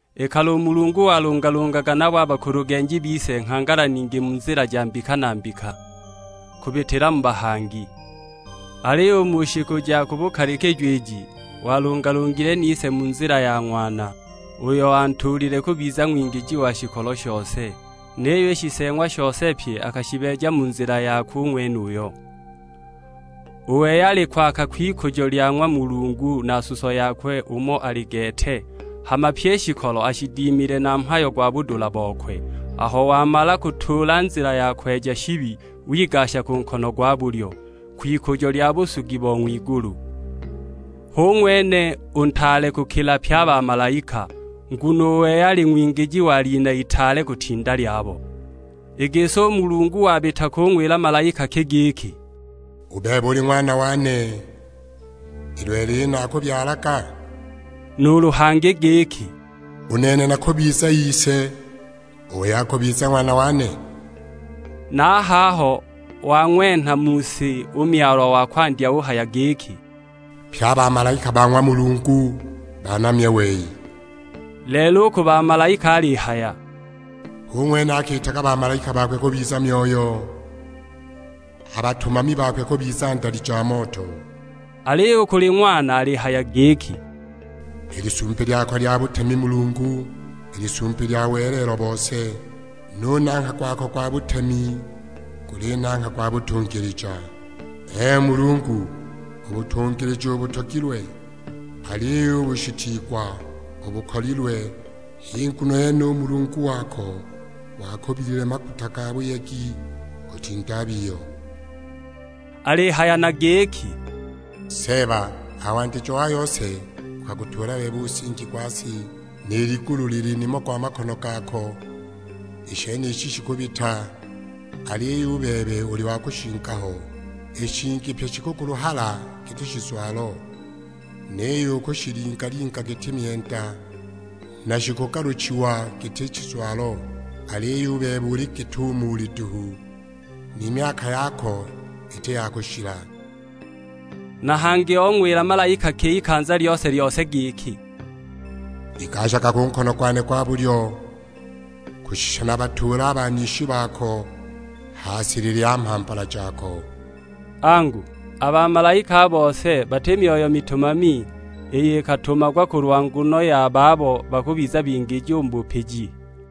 I kale u Mulungu walungalungaga nabo a bakulugenji bise nghangala ningi mu nzila ja mbika na mbika, kubitila mu bahangi. Aliyo u mu shiku ja ku bukalikijo iji, walungalungile nise mu nzila ya Ng'wana, uyo antuulile kubiza ng'wingiji wa shikolo shose; niyo i shiseeng'wa shose pye akashibeeja mu nzila yakwe u ng'wenuyo. U wei ali kwaaka kw'ikujo lya ng'wa Mulungu, na suso yakwe umo ali gete; hama pyi i shikolo ashidimile na mhayo gwa budula bokwe. Aho wamala kutuula nzila ya kweja shibi, wigasha ku nkono gwa bulyo; kwikujo lya busugi bo ng'wigulu. Hu ng'wene u ntaale kukila pye a bamalaika, nguno u wei ali ng'wingiji wa lina itaale kutinda lyabo. I gisi u Mulungu wabita kung'wila malaika ki giki, "U bebe uli Ng'wana wane, i lelo iyi naakubyalaga?" Nuulu hangi giki, "U nene nakubiza Ise; u wei akubiza Ng'wana wane?" Na a haho wang'wenha mu si u Myalwa wa kwandya uhaya giki, "Pye a bamalaika ba ng'wa Mulungu banamye wei." Lelo u ku bamalaika alihaya, "Hu ng'wene akiitaga bamalaika bakwe kubiza myoyo, a batumami bakwe kubiza ndali ja moto." Aliyo u kuli Ng'wana alihaya giki, "I lisumbi lyako lya butemi Mulungu, lil'isumbi lya welelo bose; nu nangha gwako gwa butemi guli nangha gwa butungilija. Ee Mulungu, u butungilija ubutogilwe, aliyo u bushitiigwa ubukolilwe; h'i nguno yene u Mulungu wako wakubilile maguta ga buyegi kutinda a biyo." Alihaya na giki, "Seeba, a ha wandijo wa yose ukagutuula bebe u nsingi gwa si, ni ligulu lili nimo gwa makono gako. I shenishi shikubita, aliyo u bebe uli wa kushinga ho; i shingi pyi shikukuluhala giti shizwalo. Niyo ukushilingalinga giti myenda, na shikugaluchiwa giti shizwalo. Aliyo u bebe uli git'umo uli duhu, ni myaka yako iti ya kushila." Na hangi ong'wila malaika ki ikanza lyose-lyose giki, "Igashaga ku nkono gwane gwa bulyo, kushisha nabatuule a banishi bako ha silili ya mhambala jako?" Angu, a bamalaika a bose bati myoyo mitumami, iyo ikatumagwa kulwa nguno ya babo bakubiza bingiji u mu bupiji?